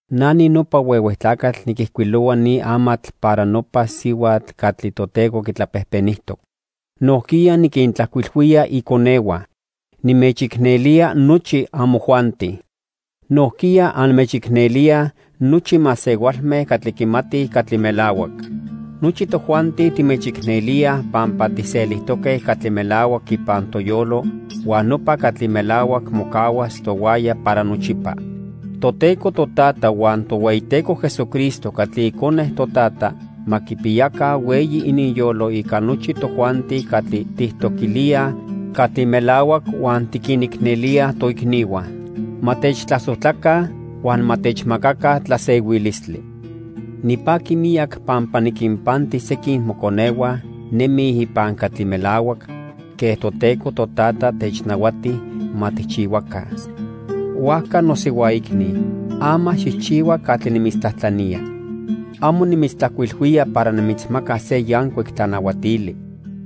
Na ninopa huehue tlacatl niquijcuilohua ni amatl para nopa sihuatl catli Toteco quitlapejpenijtoc. Nojquiya niquintlajcuilhuía iconehua. Nimechicnelía nochi amojuanti. Nojquiya anmechicnelíaj nochi masehualme catli quimatij catli melahuac. Nochi tojuanti timechicnelíaj pampa tijselijtoque catli melahuac ipan toyolo huan nopa catli melahuac mocahuas tohuaya para nochipa. Toteco Totata huan Tohueyiteco Jesucristo catli Icone Totata ma quipiyaca hueyi ininyolo ica nochi tojuanti catli tijtoquilíaj catli melahuac huan tiquinicnelíaj toicnihua. Ma techtlasojtlaca huan ma techmacaca tlasehuilistli. Nipaqui miyac pampa niquinpanti sequin moconehua nemij ipan catli melahuac quen Toteco Totata technahuati ma tijchihuaca. Huajca nosihuaicni, ama xijchihua catli nimitztlajtlanía. Amo nimitztlajcuilhuía para nimitzmacas se yancuic tlanahuatili.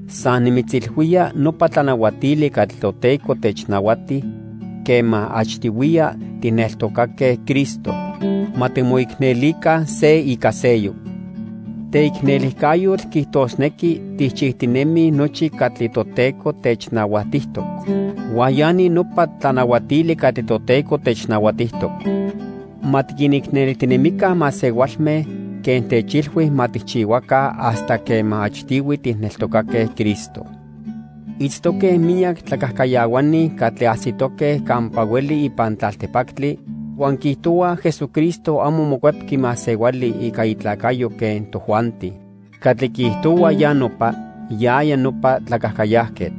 San nimitzilhuía nopa tlanahuatili catli Toteco technahuati quema achtihuiya tijneltocaque Cristo. Ma timoicnelica se ica seyoc. Teicnelijcayotl quiijtosnequi tijchijtinemij nochi catli Toteco technahuatijtoc. Huan ya ni nopa tlanahuatili catli Toteco technahuatijtoc: Ma tiquinicnelijtinemica masehualme quen techilhui ma tijchihuaca hasta quema achtihui tijneltocaque Cristo. Itztoque miyac tlacajcayahuani catli ajsitoque campa hueli ipan tlaltipactli huan quiijtohuaj Jesucristo amo mocuepqui masehuali ica itlacayo quen tojuanti. Catli quiijtohua ya nopa, yaya nopa tlacajcayajquetl.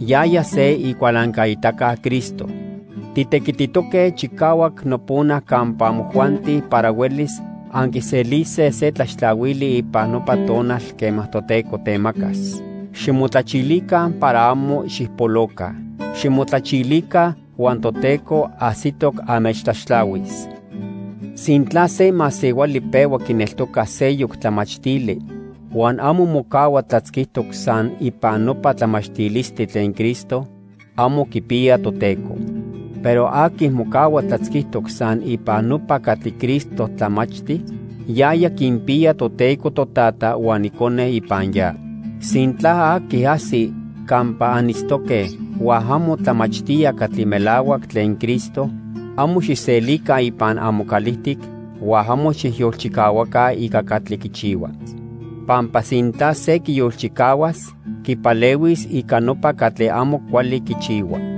Yaya se icualancaitaca Cristo. Titequititoque chicahuac nopona campa amojuanti para huelis anquiselise se tlaxtlahuili ipan nopa tonal quema Toteco temacas. Ximotlachilica para amo xijpoloca. Ximotlachilica huan Toteco ajsitoc anmechtlaxtlahuis. Sintla se masehuali pehua quineltoca seyoc tlamachtili huan amo mocahua tlatzquitoc san ipan nopa tlamachtilistli tlen Cristo, amo quipiya Toteco. Pero aqui mocahua tlatzquitoc san ipan nopa catli Cristo tlamachti, yaya quinpiya Toteco Totata huan Icone ipan ya. Sintla aqui ajsi campa anitztoque huan amo tlamachtía catli melahuac tlen Cristo, amo xijselica ipan amocalijtic huan amo xijyolchicahuaca ica catli quichihua. Pampa sintla se quiyolchicahuas, quipalehuis ica nopa catli amo cuali quichihua.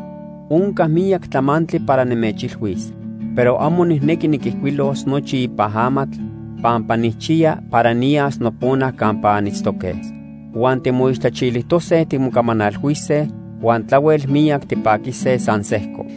Onca miyac tlamantli para nimechilhuis, pero amo nijnequi niquijcuilos nochi ipan amatl pampa nijchiya para niyas nopona campa anitztoque. Huan timoixtlachilijtose timocamanalhuise huan tlahuel miyac tipaquise san sejco.